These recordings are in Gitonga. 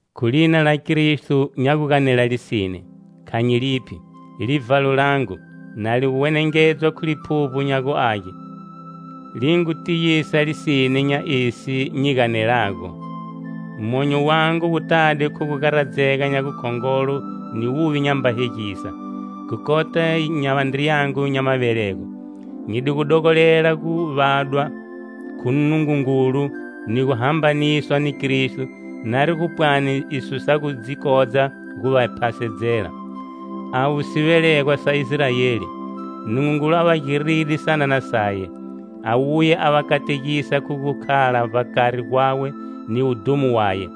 Khu lina la Kristo nya gu ganela lisine, kha nyi liphi. Livhalo langu, na li gu wenengedzwa khu Liphuvbo nya gu Age, li ngu tiyisa lisine nya esi nyi ganelago. Monyo wangu wu tade khu gu garadzega nya gukhongolo ni wuvi nyamba hegisa, khu kota nya vandriyangu nya mavelego. Nyi di gu dogolela gu vadwa khu Nungungulu ni gu hambaniswa ni Kristo, nari gu pwani iso sa gu dzi kodza gu va phasedzela. Avo sivelegwa sa Israeli. Nungungulu a va giride sanana saye, a wuya a va kategisa khu gu khala vbakari gwawe ni wudhumo waye;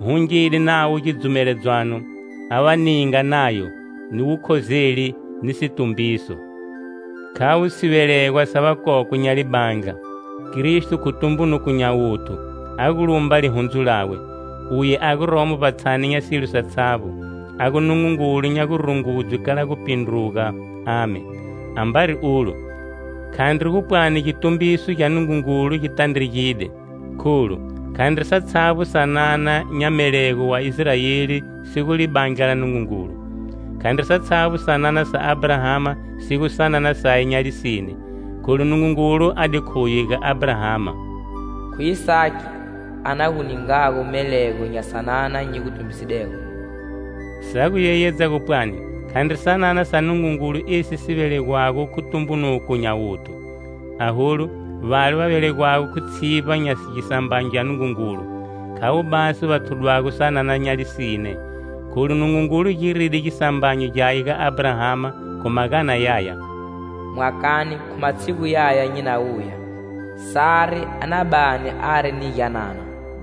hungide navo gidzumeledzwano, a va ninga Nayo, ni wukhozeli; ni situmbiso. Khavo sivelegwa sa vakokwe nya libandla; Kristo, khu tumbunuko nya wuthu, a gu lumba lihundzu lawe, uye a guromo vbatshani nya silo satshavbo, a gu Nungungulu nya gurungudzwe kala gupindruga. Amen! Ambari ulo, khandri gu pwani gitumbiso gya Nungungulu gi tandregide. Kholu, khandri satshavbo sanana nya melego wa Israeli si gu libandla la Nungungulu. Khandri satshavbo sanana sa Abrahama si gu sanana saye nya lisine, kholu Nungungulu a di khuye ga Abrahama: "Khu Isaki a na gu ningago melego nya sanana nyi gu tumbisidego" sa gu yeyedza gu pwani: khandri sanana sa Nungungulu esi si velegwago khu tumbunuko nya wuthu; aholu, vale va velegwago khu tshivba nya gisambanyo gya Nungungulu, khavo basi va thudwago sanana saye nya lisine. Kholu Nungungulu giride gisambanyo gyaye ga Abrahama khu magana yaya: "Mwakane, khu matshigu yaya nyi na wuya, Sare a na bani ari ni gyanana"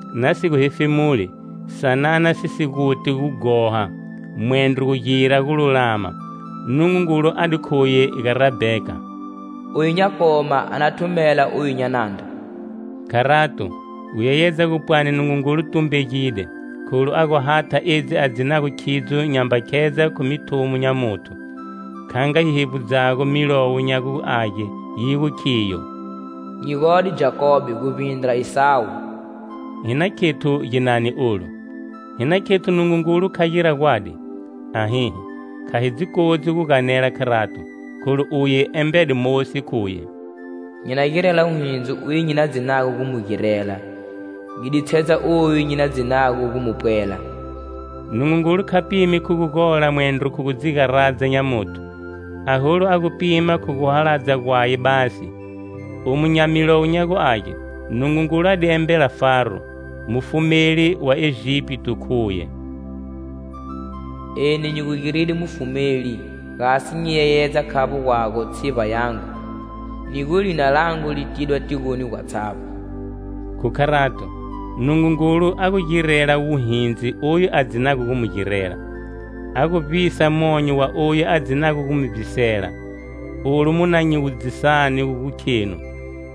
Nasi gu hefemuli, sanana si si guti gughoha, mwendro gu gira gululama, Nungungulu a di khuye ga Rabheka: "Oyu nya koma a na thumela oyu nya nandra". Kharato, gu yeyedza gu pwane Nungungulu tumbegide, kholu a gu hatha edzi a dzinago khidzo, nyamba khedza khu mithumo nya muthu, kha nga yi hevbudzago Milowo nya gu Age, yi gu khiyo: "Nyi gode Jakobe guvbindra Isawu". Hi na khethu ginani olu? Hi na khethu Nungungulu kha gira gwadi? Ahihi, kha hi dzi kodzi gu ganela kharato. Kholu uye embede Mosi khuye: "Nyi na girela wuhindzi uye nyi na dzinago gu mu girela, nyi ditshedza oyu nyi na dzinago gu mu pwela" Nungungulu kha pimi khu gugola mwendro khu gu dzigaradza nya muthu, aholu a gu pima khu guhaladza gwaye basi. Omu nya Milowo nya gu Age, Nungungulu a di embela Faro, mufumeli wa Egipito khuye: "Eni nyi gu giride mufumeli gasi nyi yeyedze khavbo gwago tshivba yangu, ni gu lina langu li tidwa tigoni gwatshavbo." Khu kharato, Nungungulu a gu girela wuhindzi oyu a dzinago gu mu girela, a gu vivbisa monyo wa oyu a dzinago gu mu vivbisela. Olu mu na nyi wudzisani gu khenu: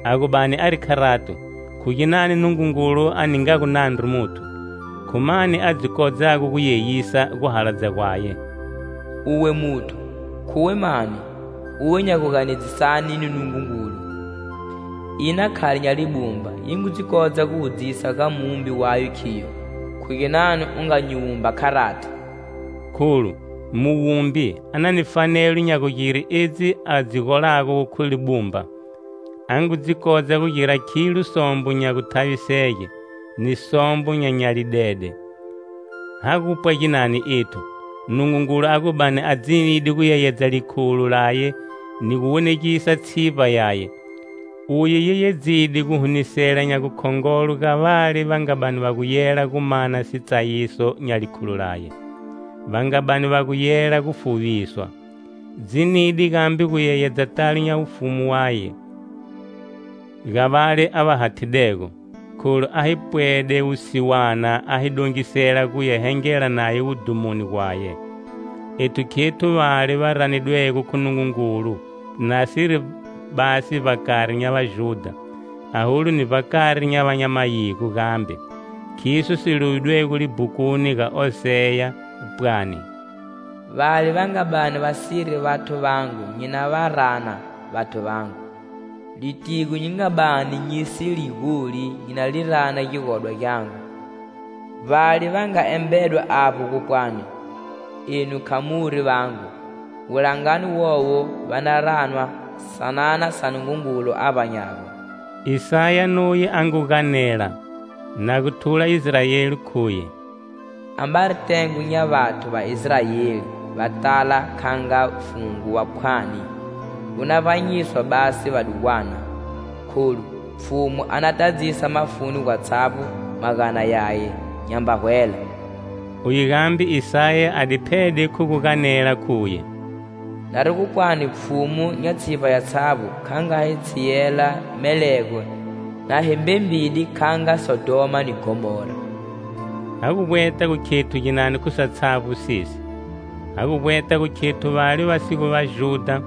"A gu bani ari kharato, khu ginani Nungungulu a ningago nandru muthu? Khu mani, a dzi kodzago gu yeyisa guhaladza gwaye?" Uwe muthu, khuwe mani, uwe nya guganedzisane ni Nungungulu? Ina khali nya libumba yi ngu dzi kodza gu wudzisa ga muwumbi wayo, khigyo: "Khu ginani u nga nyi wumba kharati?" Kholu muwumbi a na ni fanelo nya gugire edzi a dzi golago khu libumba. A ngu dzi kodza gugira khilo sombo nya guthavisege, ni sombo nya nyalidede. Ha gupwa ginani ethu, Nungungulu a gu bani a dzinide gu yeyedza likhulo laye ni gu wonegisa tshivba yaye? Uye yeyedzide guhunisela nya gukhongolo ga vale va nga bani va gu yela gu mana sitsayiso nya likhulo laye, va nga bani va gu yela gu fuviswa. Dzinide gambe guyeyedza talo nya wufumu waye ga vale a va hathidego, kholu a hi pwede wusiwana a hi dongisela guya hengela naye wudhumoni gwaye. Ethu khethu vale va ranidwego khu Nungungulu nasiri basi vbakari nya Vajudha, aholu ni vbakari nya va nya mayigo gambe. Khiso si lovidwego libhukuni ga Oseya, pwani: "Vale va nga bani va siri vathu vangu nyi na va rana: 'Vathu vangu'.Litigo nyi nga bani nyi si li goli nyi na li rana gigodwa gyangu. Vbale va nga embedwa avbo gupwani:'Enu kha muri vangu',wulangani wowo va na ranwa:'Sanana sa Nungungulu a vbanyago.' " Isaya nuye a ngu ganela, na gu thula Israeli, khuye. "Ambari tengo nya vathu va Israeli va tala kha nga fungo wa phwani, gu na vbanyiswa basi vadugwana. Kholu Pfhumu a na tadzisa mafuni gwatshavbo magana yaye, nyamba hwela". Uye gambe Isaya a di phede khu gu ganela khuye: "Nari gu pwani Pfhumu nya tshivba yatshavbo kha nga hi tshiyela melego na hi mbembide kha nga Sodhoma ni Gomora." Ha gu vbweta gu khethu ginani khu satshavbo sesi? Ha gu vbweta gu khethu vale va si gu Vajudha,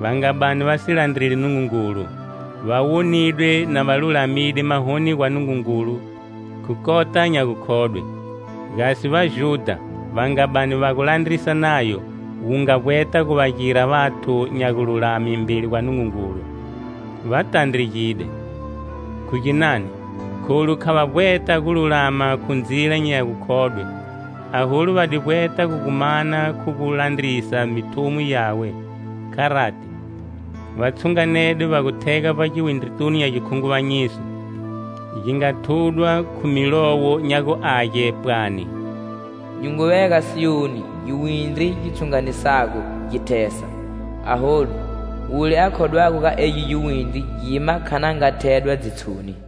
va nga bani va si landreli Nungungulu, va wonidwe na va lulamide mahoni gwa Nungungulu khu kota nya gukhodwe. Gasi Vajudha, va nga bani va gu landrisa Nayo, wu nga vbweta gu va gira vathu nya gululame mbeli gwa Nungungulu, va tandregide. Khu ginani? Kholu kha va vbweta gululama khu ndzila nya gukhodwe, aholu va di vbweta gu gu mana khu gu landrisa mithumo yawe. Kharati, va tshunganede va gu thega vbagiwindritunu nya gikhunguvanyiso, gi nga thudwa khu Milowo nya gu Age pwani: "Nyi ngu vega Siyoni giwindri gi tshunganisago gi thesa.Aholu, wule a khodwago ga egi giwindri gima kha na nga thedwa dzitshoni".